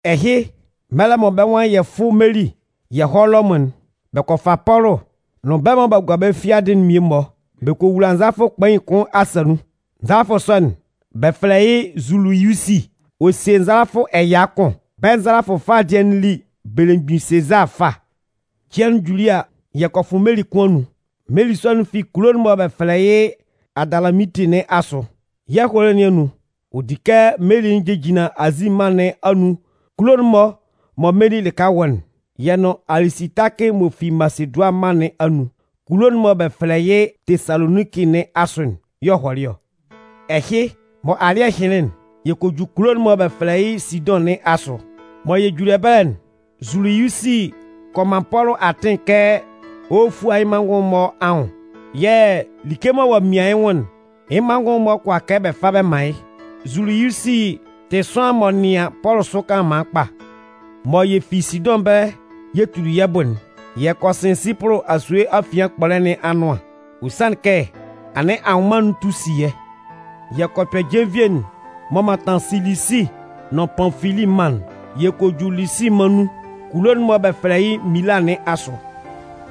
Ɛhɩ, mɛlɛ mɔ bɛ́ nwan yɛ fʋ́ meli yɛ hɔ́ Lɔmʋn'n, bɛ kɔ fa Pɔlʋ nʋn bɛ́ mɔ b'a gua bɛ́ fiadɩ'n mmie-mɔ bɛ kɔ wula nzalafʋ kpain kʋn asa nun. Nzalafʋ sɔ'n, bɛ fɛlɛ yɩ́ Zuliyusi. Ɔ sie nzalafʋ ɛya kʋn. Bɛ́ nzalafʋ fâ dɩɛ'n li “Belemgbin Sezaa Fâ” Cɩan'n juli a, yɛ kɔ fʋ meli kʋn anun. Meli sɔ'n fi kulo'n mɔ bɛ fɛlɛ yɩ́ Adalaminti nɩn asʋ. Yɛ́ ɛhɔlɛ nɩn anun, ɔ di kɛ meli'n jejinlan Azi mân nɩn anun kulo'n-mɔ mɔ meli lɩka wɔ'n. Yɛ nʋn Alisitakɩ m'ɔ fi Masedʋanɩn mân nɩn anun kulo'n mɔ bɛ fɛlɛ yɩ́ Tesaloninki nɩn asʋ'n y'ɔ hɔlɩ ɔ. Ɛhɩ, mɔ alɩ́ɛ hɩnlɩn'n, yɛ kɔ ju kulo'n mɔ bɛ fɛlɛ yɩ́ Sidʋn nɩn asʋ. Mɔ yɛ juli ɛbɛlɛ'n, Zuliyusi kɔ man Pɔlʋ atɩn kɛ ɔ hɔ́ fúa yɩ́ manngʋn'n-mɔ anwʋn yɛ̂ like mɔ ɔ'a mian yɩ́ nwʋn'n, yɩ́ manngʋn'n-mɔ kʋala kɛ bɛ fa bɛ man yɩ́. Zuliyusi tɩ sʋanlan m'ɔ nɩan Pɔlʋ sʋ kanlanman kpa. Mɔ yɛ fi Sidʋn ɛbɛlɛ yɛ tuli yɛ́ bʋ'n, yɛ kɔ sɩn Sipʋlʋ asue afian kpɔlɛ nɩn anʋan. Ɔ sanlɩn kɛ anɩn anwʋnman'n tu si yɛ́. Yɛ kɔ kpɛ jenvie'n m'ɔ mantan Silisi nʋn Panfili mân'n. Yɛ kɔ ju Lisi mân nun kulo'n mɔ bɛ fɛlɛ yɩ́ Mila nɩn asʋ.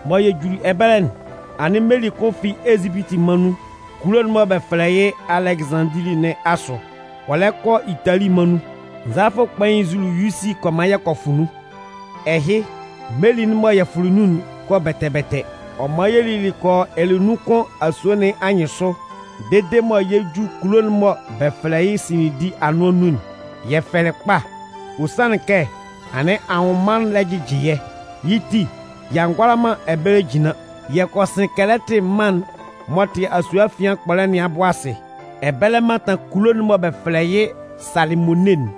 Mɔ yɛ juli ɛbɛlɛ'n, anɩn meli kʋn fi Ezipiti mân nun kulo'n mɔ bɛ fɛlɛ yɩ́ Alɛgɩzanndili nɩn asʋ ɔ lɛ kɔ Itali mân nun. Nzalafʋ kpain Zuliyusi kɔ man yɛ kɔ fʋ nun. Ɛhɩ, meli'n mɔ yɛ fʋlɩ nun'n kɔ bɛtɛ-bɛtɛ. Ɔ man yɛ lili kɔ yɔ ɛlɛnun kʋn asue nɩn anyɩnsʋ dede mɔ yɛ 'ju kulo'n mɔ bɛ fɛlɛ yɩ́ Sinindi anʋan nun'n, yɛ fɛlɩ kpa. Ɔ sanlɩn kɛ anɩn anwʋnman'n lɛ jɩjɩ yɛ́. Yɩ́ ti, y'a ngʋala man ɛbɛlɛ jinlan. Yɛ kɔ sɩn Kɛlɛtɩ mân'n m'ɔ tɩ asue afian kpɔlɛ nɩn abʋ asɩ. Ɛbɛlɛ mantan kulo'n mɔ bɛ fɛlɛ yɩ́ Salɩmone'n.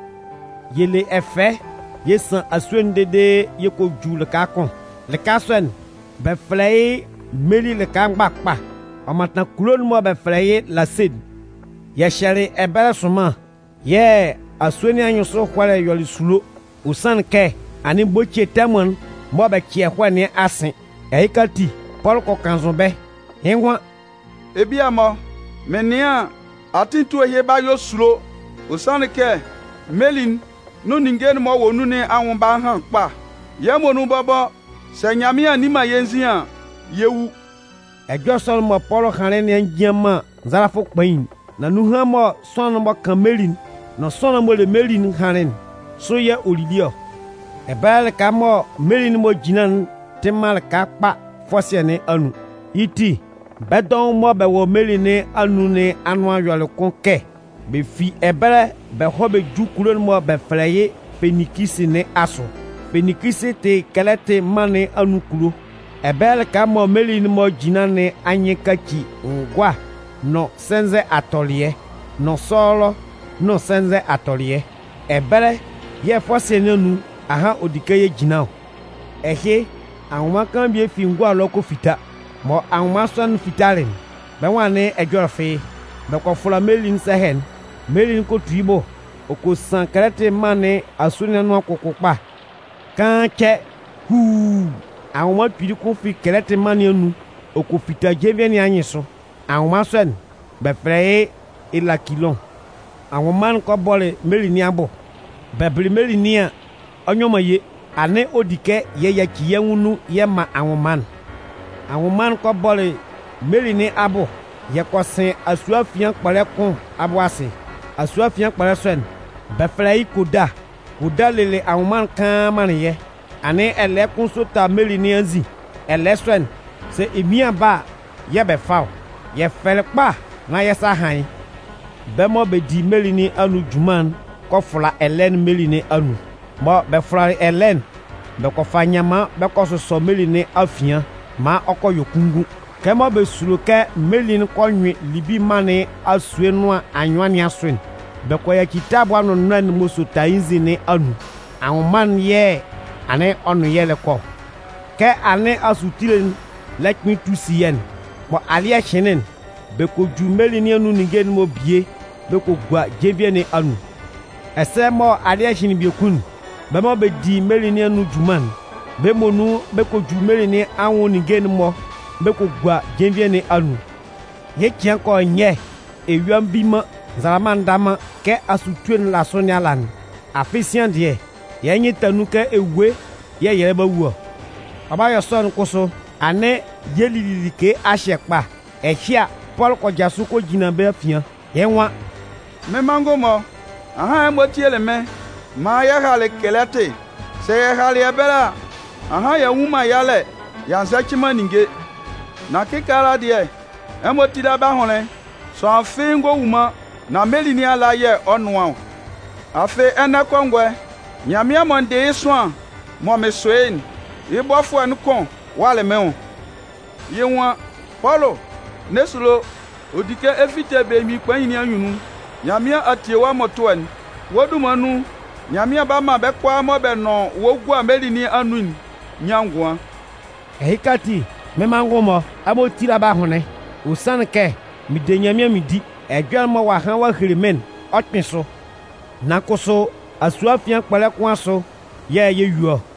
Yɛ le ɛfɛ yɛ san asue'n dede yɛ kɔ ju lɩka kʋn. Lɩka sɔ'n, bɛ fɛlɛ yɩ́ “Meli lɩka Mgbakpa”, ɔ mantan kulo'n mɔ bɛ fɛlɛ yɩ́ Lase'n. Yɛ hyɛlɩ ɛbɛlɛ sʋnman yɛ̂ asue nɩn anyɩnsʋ ɛhɔlɛ'n yɔlɩ esulo. Ɔ sanlɩn kɛ anɩn bocie tɛmʋn'n mɔ bɛ cɩ ɛhɔɛ nɩn a sɩn. Ɛhɩka ati, Pɔlʋ kɔ kannzʋ bɛ́. Yɩ́ nwan “Ebia-mɔ, mɩn nɩan an, atɩn etue ɛhɩ 'ba yɔ esulo. Ɔ sanlɩn kɛ meli'n nʋn ninnge'n m'ɔ wɔ nun nɩn anwʋn 'ba han kpa. Yɛ́ muonun bɔbɔ, sɛ Nyanmɩan a nni man yɛ́ nzin an, yɛ 'wu.” Ɛjɔlɛ sɔ'n mɔ Pɔlʋ hanlɩn nɩn a njian man nzalafʋ kpain'n. Nan nunhan mɔ sʋanlan'n m'ɔ kan meli'n nʋn sʋanlan'n m'ɔ le meli'n hanlɩn'n, sʋ yɛ̂ ɔ lili ɔ. Ɛbɛlɛ lɩka mɔ meli'n-mɔ jinlan'n tɩ man lɩka kpa fɔsɩɛ nɩn anun. Yɩ́ ti, bɛ́ dɔʋn mɔ bɛ wɔ meli nɩn anun nɩn anʋan yɔlɩ kʋn kɛ bɛ fi ɛbɛlɛ bɛ hɔ́ bɛ jú kulo'n mɔ bɛ fɛlɛ yɩ́ Feninkisi nɩn asʋ. Feninkisi tɩ Kɛlɛtɩ mân nɩn anun kulo. Ɛbɛlɛ lɩka mɔ meli'n-mɔ jinlan nɩn anyɩn kaci ngʋa nʋn sɛnzɛ atɔlɩɛ nʋn sɔlɔ nʋn sɛnzɛ atɔlɩɛ. Ɛbɛlɛ yɛ̂ fɔsɩɛ nɩn anun ahan ɔ di kɛ yɛ jinlan ɔ. Ɛhɩ, anwʋnman kaan bie fi ngʋa ɛlɔ ɔ kɔ fita. Mɔ anwʋnman sɔ'n fitalɩ'n, bɛ́ nwan anɩn ɛjɔlɛ fɩ́ɩ́. Bɛ kɔ fʋla meli'n sɛhɛ'n, meli'n kɔ tu yɩ́ bʋ ɔ kɔ san Kɛlɛtɩ mân nɩn asue nɩn anʋan kʋkʋ kpa. Kaan cɛ, huuu, anwʋnman kpili kʋn fi Kɛlɛtɩ mân nɩn anun ɔ kɔ fita jenvie nɩn anyɩnsʋ. Anwʋnman sɔ'n, bɛ fɛlɛ yɩ́ “Elakilʋn”. Anwʋnman'n kɔ bɔlɩ meli nɩn abʋ. Bɛ bɩlɩ meli nɩn an, ɔ nyɔ man ye. Anɩn ɔ di kɛ yɛ yaci yɛ́ nwʋn nun yɛ man anwʋnman'n. Anwʋnman'n kɔ bɔlɩ meli nɩn abʋ yɛ kɔ sɩn asue afian kpɔlɛ kʋn abʋ asɩ. Asue afian kpɔlɛ sɔ'n, bɛ fɛlɛ yɩ́ Koda. Koda lelɩ anwʋnman'n kaan manlɩn yɛ́. Anɩn ɛlɛɛ kʋn sota meli nɩn anzin. Ɛlɛɛ sɔ'n, sɛ emian ba a yɛ̂ bɛ fa ɔ. Yɛ fɛlɩ kpa nán yɛ́ sa a han yɩ́. Bɛ́ mɔ bɛ di meli nɩn anun junman'n kɔ fʋla ɛlɛɛ'n meli nɩn anun. Mɔ bɛ fʋlalɩ ɛlɛɛ'n, bɛ kɔ fa nyanman bɛ kɔ sʋsɔ meli nɩn afian maan ɔ kɔ yɔ kunngun. Kɛmɔ bɛ sulo kɛ meli'n kɔ nyʋɩn Libi mân nɩn asue nʋan anyʋan nɩn asʋ'n, bɛ kɔ yaci tabʋa nʋnnɔɛ'n m'ɔ sota yɩ́ nzin nɩn anun, anwʋnman'n yɛ̂ anɩn ɔ nʋn yɛ́ lɛ kɔ ɔ. Kɛ anɩn asutue'n lɛ kpɩn tu si yɛ́'n, mɔ alɩ́ɛ hɩnlɩn'n, bɛ kɔ ju meli nɩn anun ninnge'n-mɔ bie bɛ kɔ gua jenvie nɩn anun. Ɛsɛ mɔ alɩ́ɛ hɩnlɩn biekun'n, bɛ mɔ bɛ di meli nɩn anun junman'n, bɛ́ muonun bɛ kɔ ju meli nɩn anwʋn ninnge'n-mɔ bɛ kɔ gua jenvie nɩn anun. Yɩ́ cɩan kɔ yɔ nyɛ, eyua nvi man, nzalama nda man, kɛ asutue'n la sʋ nɩn ala'n. Afɩ sian dɩɛ, yɛ́ nyɩn ta nun kɛ ewue yɛ̂ yɛ lɛ ba wu ɔ. Ɔ 'ba yɔ sɔ'n kʋsʋ, anɩn yɛ lili like a hyɛ kpa. Ɛhɩ a, Pɔlʋ kɔ jasʋ kɔ jinlan bɛ́ afian. Yɩ́ nwan: “Mɩ́n manngʋn-mɔ, ahan ɛmɔ tielɩ mɩ́n maan yɛ halɩ Kɛlɛtɩ. Sɛ yɛ halɩ ɛbɛlɛ a, ahan y'a nnwun man yalɛ y'a nzɛcɩ man ninnge. Nan kɩkaala dɩɛ, ɛmɔ tíla bɛ́ ahʋnlɩn. Sʋanlan fɩ́ɩ́ ngɔ wu man, nan meli nɩn ala yɛ̂ ɔ 'nʋan ɔ. Afɩ ɛnɛ kɔngɔɛ, Nyanmɩan mɔ n dɩ yɩ́ sʋanlan mɔ mɩn sʋ yɩ́'n, yɩ́ bɔfʋɛ'n kʋn walɩ mɩ́n nwʋn. Yɩ́ nwan: ‘Pɔlʋ, n'ɛ sulo! Ɔ di kɛ ɛ fite belemgbin kpain nɩn anyunnun. Nyanmɩan a tie wɔ́ mmʋtʋɛ'n. Wɔ́ dunman nun, Nyanmɩan 'ba man bɛ́ kʋalaa mɔ bɛ nʋn wɔ́ gua meli nɩn anun'n nyan ngʋan.’ Ɛhɩka ati, mɩ́n manngʋn-mɔ, ɛmɔ tíla bɛ́ ahʋnlɩn. Ɔ sanlɩn kɛ mɩn de Nyanmɩan mɩn di. Ɛjɔlɛ'n mɔ ɔ'a han ɔ a hele mɩ́n'n, ɔ 'kpɩn sʋ. Nan kʋsʋ, asue afian kpɔlɛ kʋn asʋ yɛ̂ yɛ 'yue ɔ.”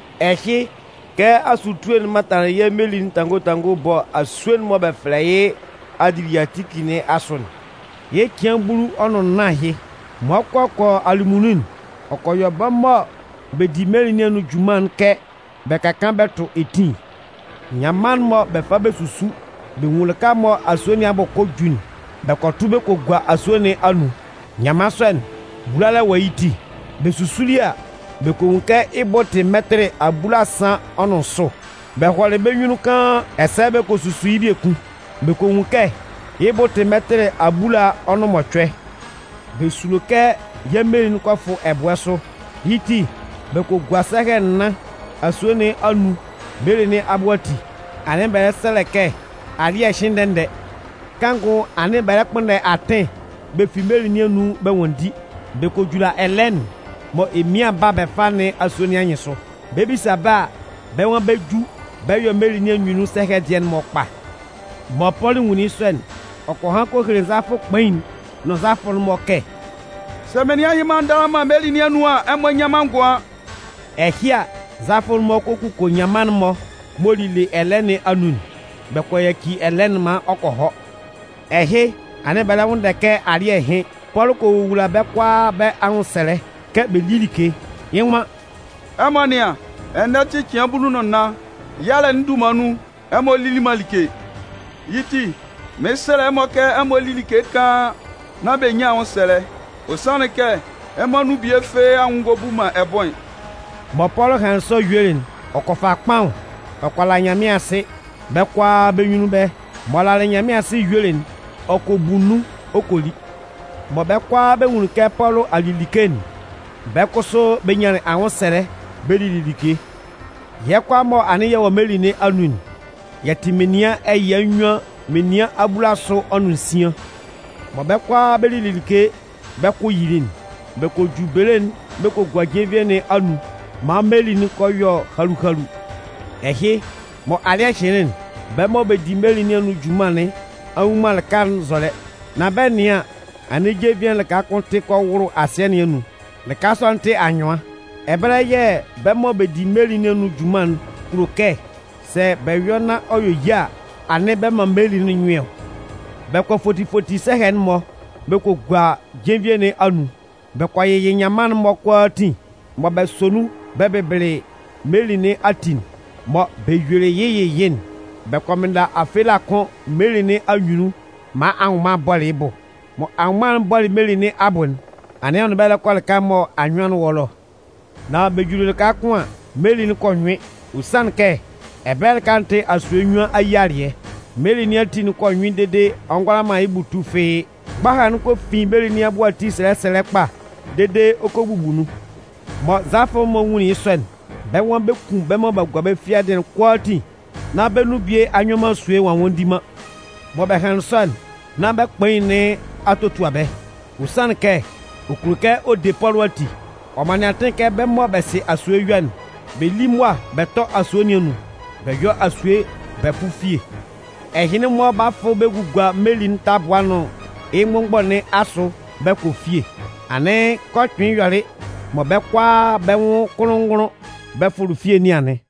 Ɛhɩ, kɛ asutue'n mantanlɩn yɛ́ meli'n tango tango ɛbɔ asue'n mɔ bɛ fɛlɛ yɩ́ Adiliyatiki nɩn asʋ'n, yɩ́ cɩan bulu ɔ nʋn nnan ahɩ. Mɔ ɔ 'kɔ kɔ yɔ alɩmunnun'n, ɔ kɔ yɔ bɛ́ mɔ bɛ di meli nɩn anun junman'n kɛ bɛ ka kaan bɛ tʋ etin. Nyanman'n mɔ bɛ fa bɛ susu bɛ nwun lɩka mɔ asue nɩn abʋ kɔ ɔ ju'n, bɛ kɔ tʋ bɛ kɔ gua asue nɩn anun. Nyanman sɔ'n, bulalɛ wɔ yɩ́ ti. Bɛ susuli a, bɛ kɔ nwun kɛ yɩ́ bʋ tɩ mɛtɩlɩ abulasan ɔ nʋn nsʋ. Bɛ hɔlɩ bɛ́ nyunnun kaan an, ɛsɛ bɛ kɔ susu yɩ́ biekun. Bɛ kɔ nwun kɛ yɩ́ bʋ tɩ mɛtɩlɩ abulaa ɔ nʋn mɔcʋɛ. Bɛ sulo kɛ yɛ́ meli'n kɔ fʋ ɛbʋɛ sʋ. yɩ́ ti, bɛ kɔ gua sɛhɛ nnan asue nɩn anun meli nɩn abʋ ati. Anɩn bɛ lɛ sɛlɛ kɛ alɩ́ɛ hɩ́n ndɛ-ndɛ. Kanngʋ anɩn bɛ lɛ kpʋnndɛ atɩn bɛ fi meli nɩn anun bɛ nwanndi. Bɛ kɔ jula ɛlɛɛ'n mɔ emian ba a bɛ fa nɩn asue nɩn anyɩnsʋ. Bɛ 'bisa bɛ́ a, bɛ́ nwan bɛ 'ju bɛ yɔ meli nɩn anyunnun sɛhɛ dɩɛ'n-mɔ kpa. Mɔ Pɔlʋ nwunlin yɩ́ sɔ'n, ɔ kɔ han kɔ hele nzalafʋ kpain'n nʋn nzalafʋɛ'n-mɔ kɛ: “Sɛ menian ɛhɩ-mɔ a ndanlan man meli nɩn anun an, ɛmɔ nnyan man ngʋan.” Ɛhɩ a, nzalafʋ'n-mɔ kɔ kuko nyanman'n-mɔ m'ɔ lile ɛlɛɛ nɩn anun'n, Bɛ kɔ yaci ɛlɛɛ'n maan ɔ kɔ hɔ. Ɛhɩ, anɩn bɛ lɛ nwʋnndɛ kɛ alɩ́ɛ hɩ́n. Pɔlʋ kɔ wowula bɛ́ kʋalaa bɛ́ anwʋnsɛlɛ kɛ bɛ lí like. Yɩ́ nwan: “Ɛmɔ nɩ́an, ɛnɛ tɩ cɩan bulu nʋn nnan, yalɛ'n dunman nun, ɛmɔ lili man like. Yɩ́ ti, mɩn 'sɛlɛ ɛmɔ kɛ ɛmɔ lí like kaan nán b'a nyan anwʋnsɛlɛ. Ɔ sanlɩn kɛ, ɛmɔ anun bie fɩ́ɩ́ anwʋn ngɔ bu man ɛbʋɩn.” Mɔ Pɔlʋ hanlɩn sɔ yuelɩ'n, ɔ kɔ fa kpaʋn, ɔ kɔ la Nyanmɩan asɩ bɛ́ kʋalaa bɛ́ nyunnun ɛbɛlɛ. M'ɔ lalɩ Nyanmɩan asɩ ɔ yuelɩ'n, ɔ kɔ bu nun ɔ kɔ li. Mɔ bɛ́ kʋalaa bɛ nwunlin kɛ Pɔlʋ a li like'n, bɛ́ kʋsʋ bɛ nyanlɩn anwʋnsɛlɛ bɛ lili like. Yɛ́ kʋalaa mɔ anɩn yɛ wɔ meli nɩn anun'n, yɛ tɩ menian ɛya nnyuan menian abulasʋ ɔ nʋn nsian. Mɔ bɛ́ kʋalaa bɛ lili like bɛ́ kʋ yili'n, bɛ kɔ ju bele'n bɛ kɔ gua jenvie nɩn anun maan meli'n kɔ yɔ halu-halu. Ɛhɩ, mɔ alɩ́ɛ hɩnlɩn'n, bɛ́ mɔ bɛ di meli nɩn anun junman nɩn a nnwun man lɩka'n nzɔlɛ. Nan bɛ 'nɩan an, anɩn jenvie'n lɩka kʋn tɩ kɔ wʋlʋ asɩɛ nɩn anun. Lɩka sɔ'n tɩ anyʋan. Ɛbɛlɛ yɛ̂ bɛ́ mɔ bɛ di meli nɩn anun junman'n kulo kɛ, sɛ bɛ yɔ nán ɔ yɔ ye a, anɩn bɛ man meli'n nyʋɩn ɔ. Bɛ kɔ foti foti sɛhɛ'n-mɔ bɛ kɔ gua jenvie nɩn anun. Bɛ kɔ yɩyɩ nyanman'n-mɔ kʋalaatin mɔ bɛ sɔ nun bɛ bɩbɩlɩ meli nɩn ati'n. Mɔ bɛ yuelɩ yɩ́ yɩyɩ'n, bɛ kɔ mɩnnda afela kʋn meli nɩn anyunnun maan anwʋnman bɔlɩ yɩ́ bʋ. Mɔ anwʋnman'n 'bɔlɩ meli nɩn abʋ'n, anɩn ɔ nʋn bɛ́ lɛ kɔ lɩka mɔ anyʋan'n wɔ ɛlɔ. Nan bɛ juli lɩka kʋn an, meli'n kɔ nyʋɩn. Ɔ sanlɩn kɛ ɛbɛlɛ lɩka'n tɩ asue nnyuan ayialɩɛ. Meli nɩn ati'n kɔ nyʋɩn dede ɔ ngʋala man yɩ́ bʋ tu fɩ́ɩ́. Mgbaha'n kɔ fin meli nɩn abʋ ati sɛlɛ sɛlɛ kpa dede ɔ kɔ bubu nun. Mɔ nzalafʋ'n-mɔ nwunlin yɩ́ sɔ'n, bɛ́ nwan bɛ 'kun bɛ́ mɔ b'a gua bɛ́ fiadɩ'n kʋalaatin nán bɛ́ nun bie a nyɔ man asue ɔ a nwanndi man. Mɔ bɛ hanlɩn sɔ'n nán bɛ́ kpain nɩn a totua bɛ́. Ɔ sanlɩn kɛ ɔ kulo kɛ ɔ de Pɔlʋ ati. Ɔ manlɩn atɩn kɛ bɛ́ mɔ bɛ sɩ asue yɔ'n, bɛ lí mʋa bɛ tɔ́ asue nɩn anun. Bɛ yɔ́ asue bɛ fʋ́ fie. Ɛhɩnlɩn-mɔ 'ba fʋ bɛ gugua meli'n tabʋa'n nʋn yɩ́ mgbʋnmgbɔ nɩn asʋ bɛ kɔ fie. Anɩn kɛ ɔ kpɩnlɩn yɔlɩ mɔ bɛ́ kʋalaa bɛ́ nwʋn kʋnlʋn-ngʋnlʋn bɛ fʋlɩ fie nɩn anɩn.